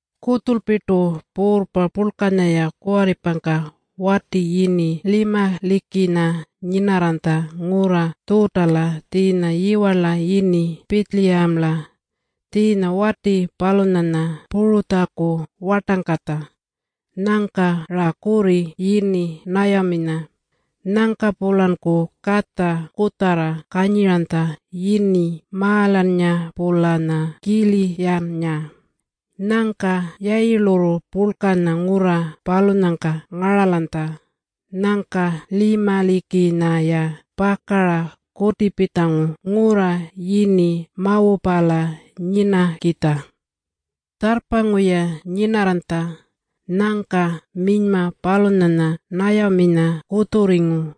Kutjulpirtu puurrpa purlkanya-ya kuwarripangka, wati yini Limalikanya nyinarranytja ngurra Tjuutala tjiinya yiwarla yini Pitjiliyamala. Tjiinya wati palunyanya Puratjaku wartangkatja. Nyangka-ra kurri yini Nayaminya. Nyangka-pulanku katja kutjarra kanyiranytja yini Maalannga-pulanya Kiliyannga. Nyangka yayilurru purlkanya ngurra palunyangka ngaralanytja. Nyangka Limalikanya-ya pakara kutipitjangu ngurra yini Mawapala nyinakitja. Tjarrpangu-ya nyinarranytja. Nyangka minyma palunyanya Nayaminya kutjurringu.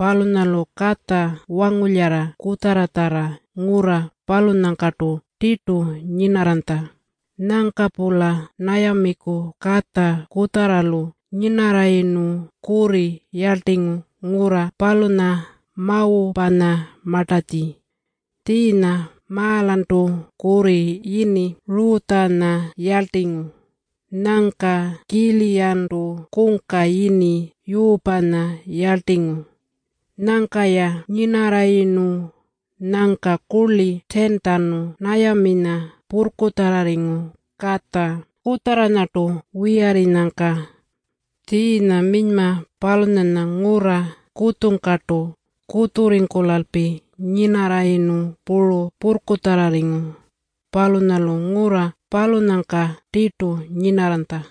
Palunyalu katja wangulyara kutjarratjarra ngurra palunyangkartu tirtu nyinarranytja. Nyangka-pula Nayamiku katja kutjarralu nyinarrayirnu kurri yarltingu ngurra palunya Mawapanyamartatji. Tjiinya Maalantu kurri yini Rutjanya yarltingu. Nyangka Kiliyantu kungka yini Yuupanya yarltingu. Nyangka-ya nyinarrayirnu, nyangka kurli 10-tjanu Nayaminya purrkutjarrarringu katja kutjarranyartu wiyarrinyangka. Tjiinya minyma palunyanya ngurra kutjungkartu kutjurringkulalpi nyinarrayirnu puru purrkutjarrarringu. Palunyalu ngurra palunyangka tirtu nyinarranytja.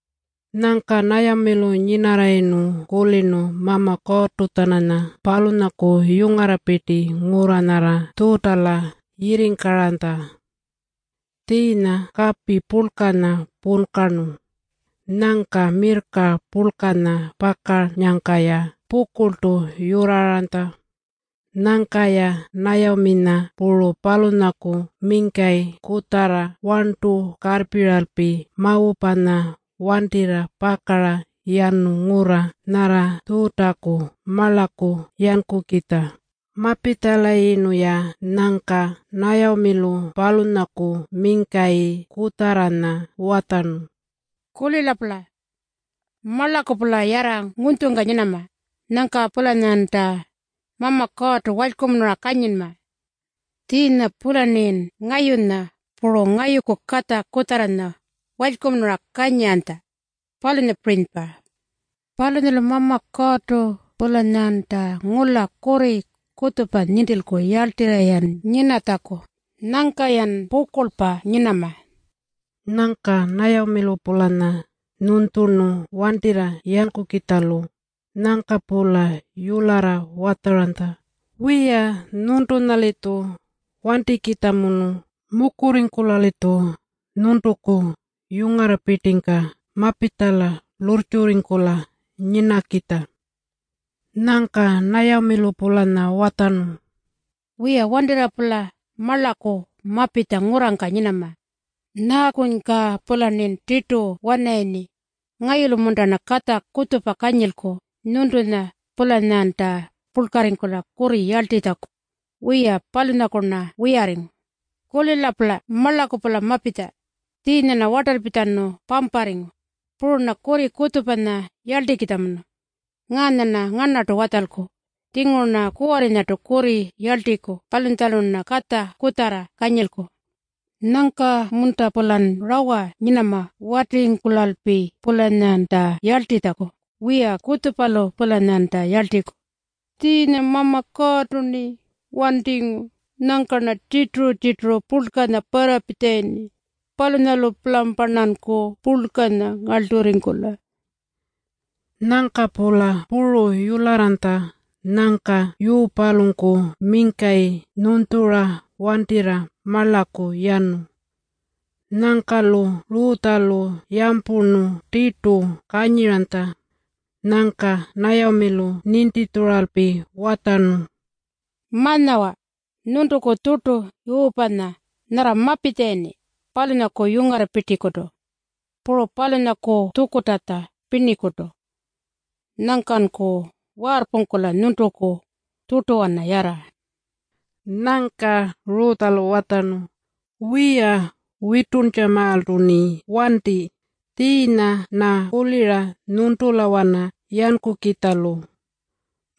Nyangka Nayamilu nyinarrayirnu kulirnu Mama Kuurrtu-tjananya palunyaku yungarrapirti ngurra nyarra Tjuutala yirringkaranytja. Tjiinya kapi purlkanya punkarnu. Nyangka mirrka purlkanya pakannyangka-ya pukurltu yurraranytja. Nyangka-ya Nayaminya puru palunyaku mingkayi kutjarra warntu karrpiralpi Mawapanya wantirra pakara yanu ngurra nyarra Tjuutaku marlaku yankukitja. Mapitjalayirnu-ya, nyangka Nayamilu palunyaku mingkayi kutjarranya watjarnu, “Kulila-pula. Marlaku-pula yarra ngunytjungka nyinama. Nyangka-pulanyanta Mama Kuurrtu walykumunura kanyinma, tjiinya-pularnin ngayunya puru ngayuku katja kutjarranya walykumunura kanyiranytja, palunyapirinypa. Palunyalu Mama Kuurrtu-pulanyanta ngula kurri kutjupa nintilku yarltirra-yan nyinatjaku. Nyangka-yan pukurlpa nyinama.” Nyangka Nayamilu-pulanya nyunytjurnu wantirra yankukitjalu. Nyangka-pula yularra watjaranytja, “Wiya, nyuntunya-litju wantikitjamunu. Mukurringkula-litju nyuntuku yungarrapirtingka mapitjala lurrtjurringkula nyinakitja.” Nyangka Nayamilu-pulanya watjarnu, “Wiya, wantirra-pula marlaku mapitja ngurrangka nyinama. Nyaakunyka-pularnin tirtu wanarayirni? Ngayulu-munta-rna katja kutjupa kanyilku nyuntunya-pulanyanta purlkarringkula kurri yarltitjaku? Wiya, palunyaku-rna wiyarringu. Kulila-pula. Marlaku-pula mapitja. Tjiinya-rna wartalpitjanu pamparringu. Puru-rna kurri kutjupanya yarltikitjamunu. Ngaanya-rna ngarnartu watjalku. Tjinguru-rna kuwarrinyartu kurri yarltiku palunyatjanulu-rna katja kutjarra kanyilku. Nyangka-munta-pulan rawa nyinama watirringkulalpi-pulanyanta yarltitjaku? Wiya! Kutjupalu-pulanyanta yarltiku. Tjiinya Mama Kuurrtu-rni wantingu. Nyangka-rna tjirturu-tjirturu purlkanya parrapitjalayirni. Palunyalu-pulamparnanku purlkanya ngarlturringkula.” Nyangka-pula puru yularranytja. Nyangka Yuupalunku mingkayi nyunytjura wantirra marlaku yanu. Nyangka-lu Rutjalu yampurnu tirtu kanyiranytja. Nyangka Nayamilu nintitjuralpi watjarnu, “Ma-nyawa nyuntuku tjurtu Yuupanya nyarra mapitjalayirni palunyaku yungarrapirtikutu, puru palunyaku tjukurrtatja pirnikutu. Nyangkanku waarrpungkula nyuntuku tjurtuwana yarra.” Nyangka Rutjalu watjarnu, “Wiya, wituntjamaaltu-rni wanti. Tjiinya-rna kulira nyuntulawana yankukitjalu.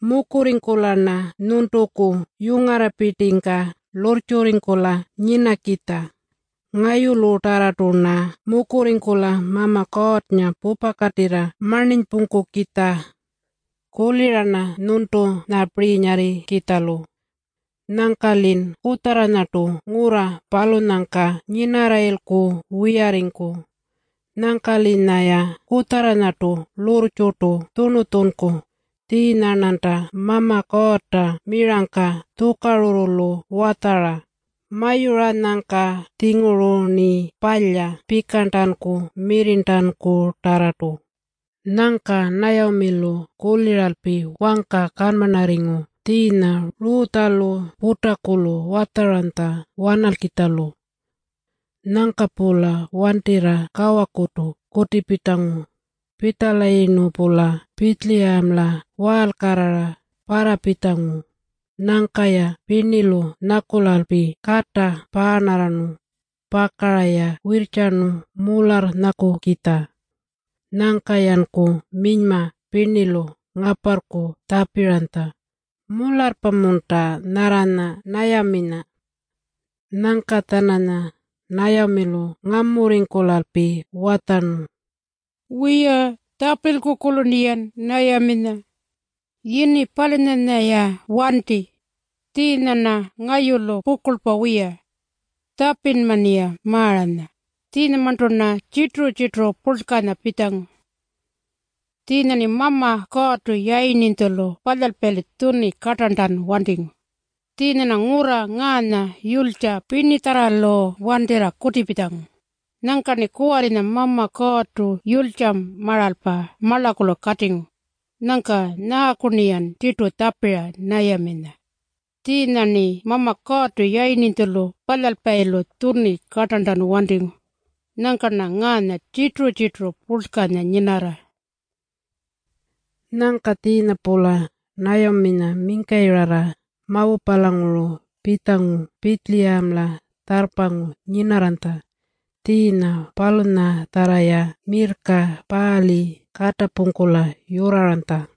Mukurringkula-rna nyuntuku yungarrapirtingka lurrtjurringkula nyinakitja. Ngayulutarrartu-rna mukurringkula Mama Kuurrnga pupakatirra marninypungkukitja. Kulira-rna nyuntunyapirinyarrikitjalu. Nyangka-lin kutjarranyartu ngurra palunyangka nyinarrayilku wiyarringku. Nyangka-linyaya kutjarranyartu lurrtjurtu tjurnutjunku. Tjiinya-rnanta Mama Kuurrta mirangka tjukarurrulu watjara. Mayuranyangka-tjinguru-rni palya pikarntanku mirrirntankutarrartu.” Nyangka Nayamilu kuliralpi wangka kanmarrarringu. Tjiinya Rutjalu putakulu watjaranytja wanalkitjalu. Nyangka-pula wantirra kawakurtu kutipitjangu. Pitjalayirnu-pula Pitjiliyamala waalkarrara parrapitjangu. Nyangka-ya pirnilu nyakulalpi kata paarnarrarnu. Pakara-ya wirrtjarnu mularrnyakukitja. Nyangka-yanku minyma pirnilu ngaparrku tjapiranytja, “Mularrpa-munta nyarranya Nayaminya?” Nyangka-tjananya Nayamilu ngamurringkulalpi watjarnu, “Wiya, tjapilku-kurlu-rniyan Nayaminya. Yini palunyanya-ya wanti. Tjiinya-rna ngayulu pukurlpa wiya. Tjapinma-rniya Maaranya, tjiinyamarntu-rna tjirturu-tjirturu purlkanya pitjangu. Tjiinya-rni Mama Kuurrtu Yayirninytjulu Palyalpayilu tjuni kartarntanu wantingu. Tjiinya-rna ngurra ngaanya yulytja pirnitjarralu wantirra kutipitjangu. Nyangka-rni kuwarrinya Mama Kuurrtu yulytjamaralpa marlakulu katingu. Nyangka nyaaku-rniyan tirtu tjapira Nayaminya? Tjiinya-rni Mama Kuurrtu Yayirninytjulu Palyalpayilu tjuni kartarntanu wantingu. Nyangka-rna ngaanya tjirturu-tjirturu purlkanya nyinarra.” Nyangka tjiinya-pula Nayaminya mingkayirra Mawapalanguru pitjangu Pitjiliyamala tjarrpangu nyinarranytja, tjiinya palunyatjarra-ya mirrka paali katapungkula yurraranytja.